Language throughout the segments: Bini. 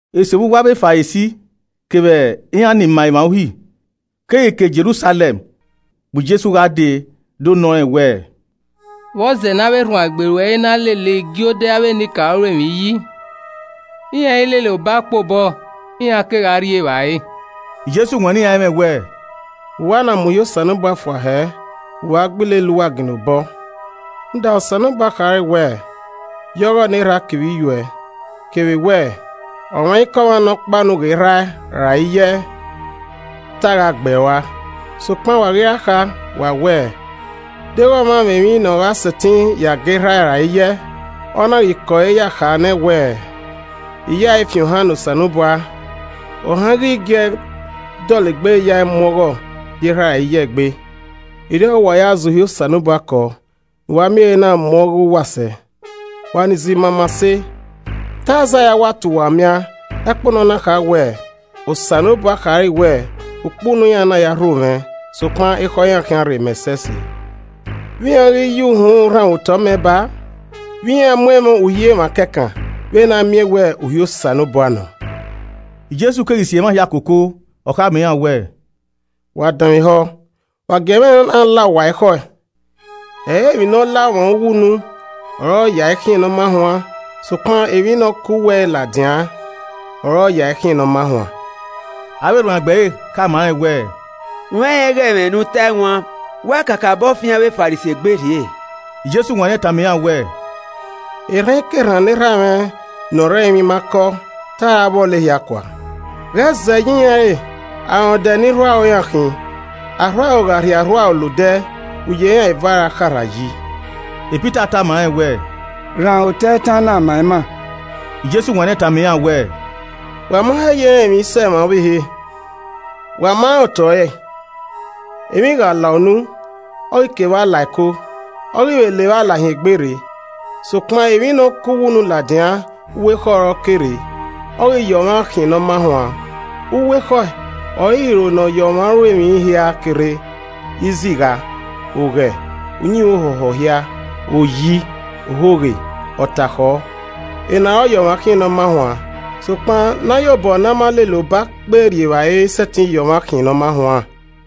Eso vbe uwu avbe Farisi kevbe iran ni ma emwa Uhi keghi ke Jerusalẹm bu Jesu gha dee do nọ rẹn wẹẹ, “Vbọzẹ ne avbe erhuanegbe ruẹ i na lele igiodẹ avbe enikaro ru emwi yi? Iran i lele ọbakpe obọ iran ke gha rri evbare.” Jesu wanniẹn iran ẹmwẹ wẹẹ, “Vbe uwa na mu uhi Osanobua fua hẹ vbe uwa gba ilele uwa ginna obọ? Rhunmwuda Osanobua khare wẹẹ, ‘Ya ọghọ ne erha a kevbe iyuẹ’ kevbe wẹẹ, ‘Ọmwaikọmwa ne ọ kpa unu ghe erha e ra iye ẹe, te a gha gbẹe rua.’ Sokpan, wa ghi ra kha, wa wẹẹ, ‘Deghẹ ọmwa mwẹ emwi ne ọ gha sẹtin ya ga erha e ra iye ẹe,’ ọ na ghi kẹ ọre ya kha nẹ wẹẹ, ‘I ya ẹe fi ohan ne Osanobua,’ ohan i ghi gi ẹe dọlegbe ya ẹe mu ọghọ ye erha e ra iye ẹe egbe. Erriọ ọre uwa ya zẹ uhi Osanobua kọ, ne uwa miẹn ehe na mu ọghe uwa sẹ. Wa ni zẹ imamase, te Aizaia wa ta uwa umian ẹkpo ne ọ na kha wẹẹ, “ ‘Osanobua khare wẹẹ, Ukpunu iran na ya rho mwẹ sokpan ekhọe iran khian rrei mẹ ẹsẹse. Vbe iran ghi ya uhunmwu rhanmwẹ otọ mẹ ba a, vbe iran mu ẹmwẹ uhi emwa kẹkan vbe na miẹn we uhi Osanobua nọ!’” Jesu keghi si emwa hia koko, ọ khama iran wẹẹ, “Wa danmwehọ, wa gie ẹmwẹ na la uwa ekhọe. Ẹ i re emwi ne ọ la ọmwa uwu unu ọre ọ ya ẹe khian ne ọ ma huan, sokpan emwi ne ọ ke uwu ẹre ladian ọre ọ ya ẹe khian ne ọ ma huan.” Avbe erhuanegbe ẹre khama rẹn wẹẹ, “U rẹnrẹn ighẹ ẹmwẹ ne u tae wan wa kakabọ fian avbe Farisi egbe rhie?” Jesu wanniẹn tama iran wẹẹ, “Erhankerhan ne erha mwẹ ne ọ rre ẹrinmwi ma kọ, te a ra vbọlọ ehia kua. Ghẹ zẹ ye iran re. Arọndẹ ni rhu aro iran khin. Arhuaro gha rhie arhuaro la odẹ uye iran eva ra kharha yi.” Pita tama rẹn wẹẹ, “Rhan otọ itan na ma ima.” Jesu wanniẹn tama iran wẹẹ, “Wa ma he ye rẹn emwi sẹ emwa ọvbehe. Wa ma rẹn otọ ẹre? Emwi gha la unu, ọ ghi ke evba la ẹko, ọ ghi vbe la evba la hin egbe rre. Sokpan, emwi ne ọ ke uwu unu ladian, uwu ekhọe ọre ọ ke rre, ọ ghi ya ọmwa khian ne ọ ma huan. Uwu ekhọe ọre iro nọ ya ọmwa ru emwi hia ke rre: izigha, oghẹ, uyinmwẹ ohọhọ hia, oyi, ohoghe, ọtakhọ. Ena ọre ọ ya ọmwa khian ne ọ ma huan, sokpan, ne a ya obọ ne a ma lele a ba kpe rri evbare i sẹtin ya ọmwa khian ne ọ ma huan.”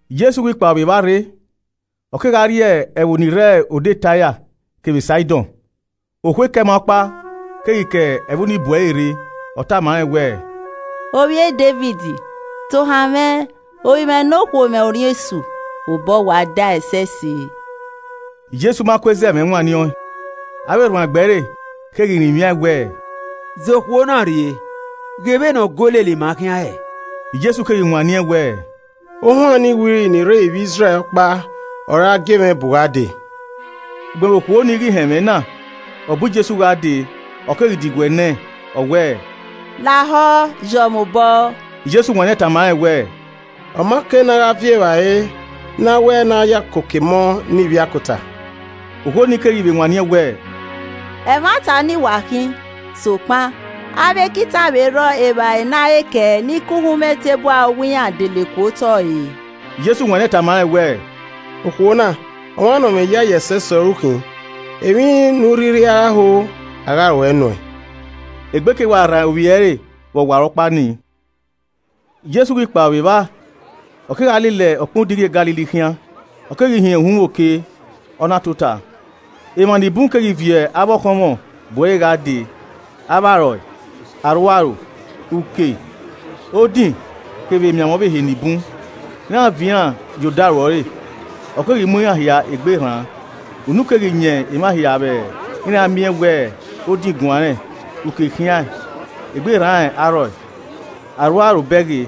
Jesu ghi kpao vbe evba rre, ọ kegha rrie ẹvbo ni rre odẹ Taia kevbe Saidọn. Okhuo Keman ọkpa keghi ke ẹvbo ni bu ẹre rre, ọ tama rẹn wẹẹ, “Ovbi e Devid, tohan mwẹ, ovbi mwẹ nokhuo mwẹ orhiọn esu, obọ wa dae ẹsẹse.” Jesu ma kue zẹ mwẹ wanniẹn ọẹn. Avbe erhuanegbe ẹre keghi rinmwiaẹn wẹẹ, “Zẹ okhuo na urrie, ghe vbene ọ go lele ima khian hẹ.” Jesu keghi wanniẹn wẹẹ, “Ohuan ni wiri ni rre ivbi Izrẹl ọkpa ọre a gie mwẹ bu gha dee.” Ugbẹn vbe okhuo nii ghi họn ẹmwẹ na, ọ bu Jesu gha dee, ọ keghi diguẹ nẹẹn, ọ wẹẹ, “Lahọ yọ mwẹ obọ.” Jesu wanniẹn tama rẹn wẹẹ, “Ọ ma kei ne a gha viọ evbare ne a wẹẹ ne a ya koko emọ ne ivbiakota.” Okhuo nii keghi vbe wanniẹn wẹẹ, “Ẹmwata ọnii wa khin, sokpan, avbe ekita vbe rhọ evbare ne a re kẹe ni ke uhunmwu eteburu arowa iran dele ku otọ re.” Jesu wanniẹn tama rẹn wẹẹ, “Okhuo na, ọmwa nọ mwẹ iyayi ẹsẹse ọre u khin, emwi ne u rhirhi gha ho, a gha ruẹe nuẹn.” Egbe ke wa rran ovbi ẹre vbe ọwarọkpa nii. Jesu ghi kpao vbe evba, ọ kegha lele ọkpẹn odighi e Galili khian, ọ keghi hin uhunmwu oke, ọ na tota. Emwa ni bun keghi viọ avbe ọkhọnmwọ bu ẹre gha dee, avbe arọe, arhuaro, uke, odin kevbe emianmwẹ ọvbehe ni bun, iran viọ iran ye odaro ẹre, ọ keghi mu iran hia egbe rran. Unu keghi yan emwa hia vbe iran miẹn wẹ odin guanrẹn, uke khiaẹn, egbe rran arọe, arhuaro bẹghe.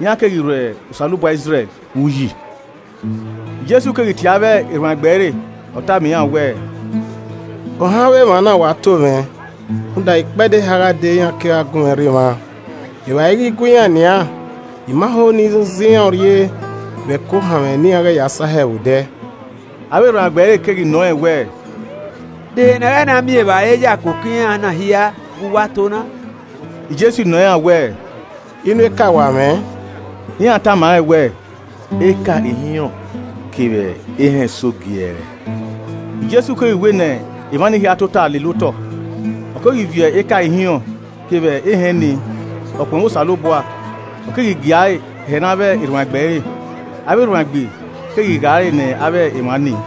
Iran keghi rho Osanobua Izrẹl vbe uyi. Jesu keghi tie avbe erhuanegbe ẹre, ọ tama iran wẹẹ, “Ohan avbe emwa na wa to mwẹ rhunmwuda ikpẹdẹ eha gha dee iran kegha gun mwẹ rre emwa, evbare ighi gue iran nian. I ma ho ne I zẹ iran urrie vbe ẹko ohanmwẹ ne iran ghẹ ya sahẹ vbe odẹ.” Avbe erhuanegbe ẹre keghi nọ rẹn wẹẹ, “De ehe ne a gha na miẹn evbare ya koko iran na hia vbe uwu ato na?” Jesu nọ iran wẹẹ, “Inu eka wa mwẹ?” Iran tama rẹn wẹẹ, “Eka ihinrọn kevbe ehẹn eso giẹẹrẹ.” Jesu keghi wẹ ne emwa ni hia tota lele otọ. Ọ keghi viọ eka ihinrọn kevbe ehẹn nii, ọ kpọnmwẹ Osanobua, ọ keghi gia ẹre hẹ ne avbe erhuanegbe ẹre, avbe erhuanegbe keghi gha ẹre ne avbe emwa nii.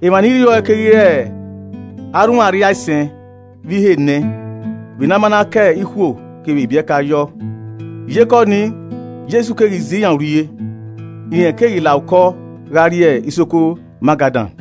Emwa ni rriọe keghi re arhunmwu arriaisẹn vbe ihe enẹ, vbe na a ma na ka ikhuo kevbe ibiẹka yọ. Iyeke ọnii, Jesu keghi zẹ iran urrie, rẹn keghi la okọ gha rrie isoko Magadan.